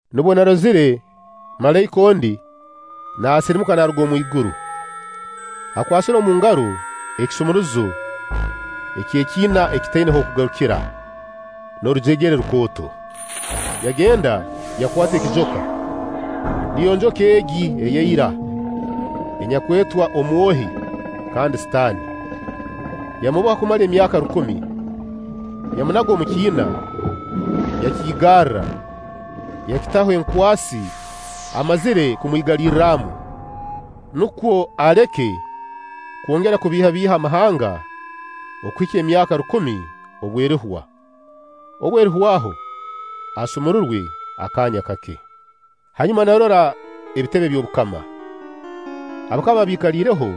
Nubwo narozire malaika ondi naasirimuka naaruga omwiguru, akwasire omu ngaro ekisumuruzo eky'ekiina ekitaina h'okugarukira n'orujegere rukooto. Yagenda yakwata ekijoka, niyo njoka egi eya ira enyakwetwa Omwohi kandi Sitaani, yamuboha kumara emyaka rukumi, yamunaga omu kiina, yakiigarra, yakitaho enkwasi amazire kumwigalirramu, nukwo aleke kwongera kubiihabiiha amahanga, okuhika emyaka rukumi obu erihwa. Obu erihwaho asumururwe akaanya kake. Hanyuma narora ebitebe by'obukama, abakaba babiikaliireho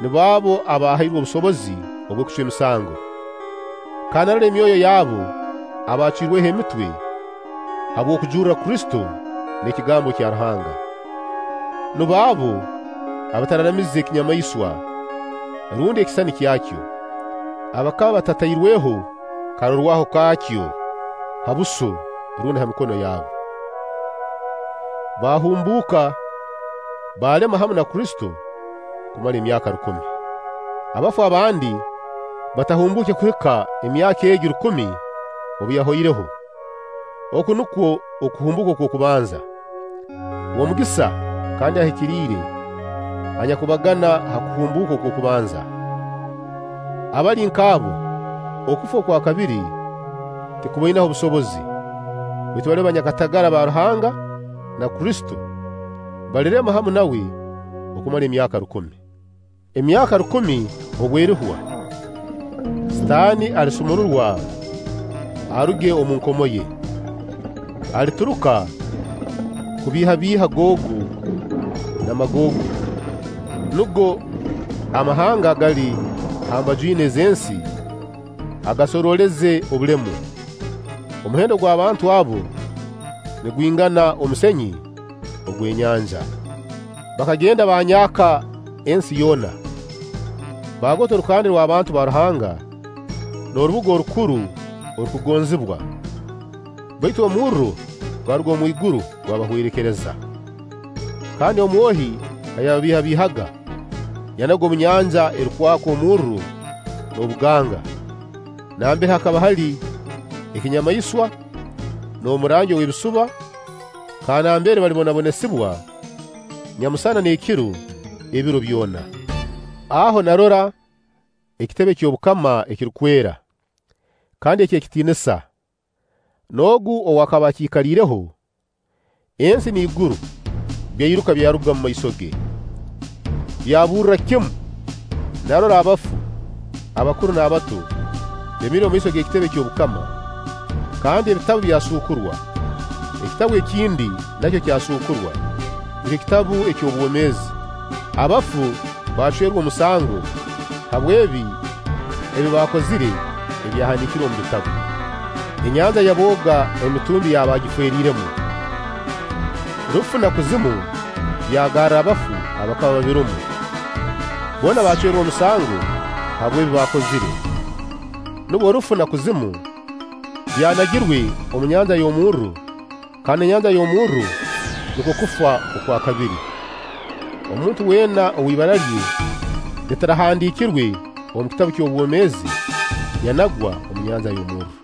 nubo abo abaahairwe obusobozi obw'okucwa emisango. Kandi narora emyoyo y'abo abaacwirweho emitwe habw'okujurra Kristo n'ekigambo kya Ruhanga. Nubo abo abatararamize kinyamaiswa rundi ekisisani kyakyo, abakaba batatairweho karorwaho kaakyo ha buso rundi ha mikono yabo. Baahumbuuka, baalema hamu na Kristo kumara emyaka rukumi. Abafu abandi batahumbuuke okuhika emyaka egi rukumi obu yahoireho. Oku mukwo okuhumbuuka okw'okubanza. W'omugisa kandi ahikiriire anyakubagana ha kuhumbuuka okw'okubanza! Abali nk'abo, okufa okwa kabiri tikubainaho busobozi; baitu baliba banyakatagara ba Ruhanga na Kristo, balirema hamu nawe okumara emyaka rukumi. Emyaka rukumi obu erihwa, Sitaani alisumururwa aruge omu nkomo ye, alituruka kubiihabiiha Gogu na Magogu, nugo amahanga agali ha mbaju ina ez'ensi agasorooleze obulemu. Omuhendo gw'abantu abo nigwingana omusenyi ogw'enyanja. Bakagenda banyaaka ensi yoona, baagota orukande rw'abantu ba Ruhanga n'orubuga orukuru orugonzibwa; baitu omurro gwaruga omwiguru gwabahwerekereza, kandi Omwohi ayababiihabiihaga yanagwa omu nyanja erukwaka omurro n'obuganga, nambere hakaba hali ekinyamaiswa n'omurangi ow'ebisuba, kandi nambere balibonabonesezibwa nyamusana n'ekiro ebiro byona. Aho narora Ekitebe ky'obukama ekirukwera kandi eky'ekitiinisa n'Ogu ow'akaba akiikaliireho. Ensi n'iguru byairuka byaruga omumaiso ge, byaburra kimu. Narora abafu, abakuru n'abato, beemeriire omumaiso g'ekitebe ky'obukama, kandi ebitabu byasuukurwa. Ekitabu ekindi nakyo kyasuukurwa, nikyo kitabu eky'obwomeezi. Abafu baacwerwa omusango habw'ebi ebi baakozire ebyahandiikirwe omu bitabu. Enyanja yabooga emitumbi y'abagiferiiremu. Rufu na Kuzimu byagarra abafu abakaba babirumu. Boona baacwerwa omusango habw'ebi baakozire. Nubwo Rufu na Kuzimu byanagirwe omu nyanja y'omurro. Kandi enyanja y'omurro, nukwo okufa okwa kabiri. Omuntu weena ow'ibara lye litarahandiikirwe omu kitabu ky'obwomeezi yanagwa omu nyanja y'omurro.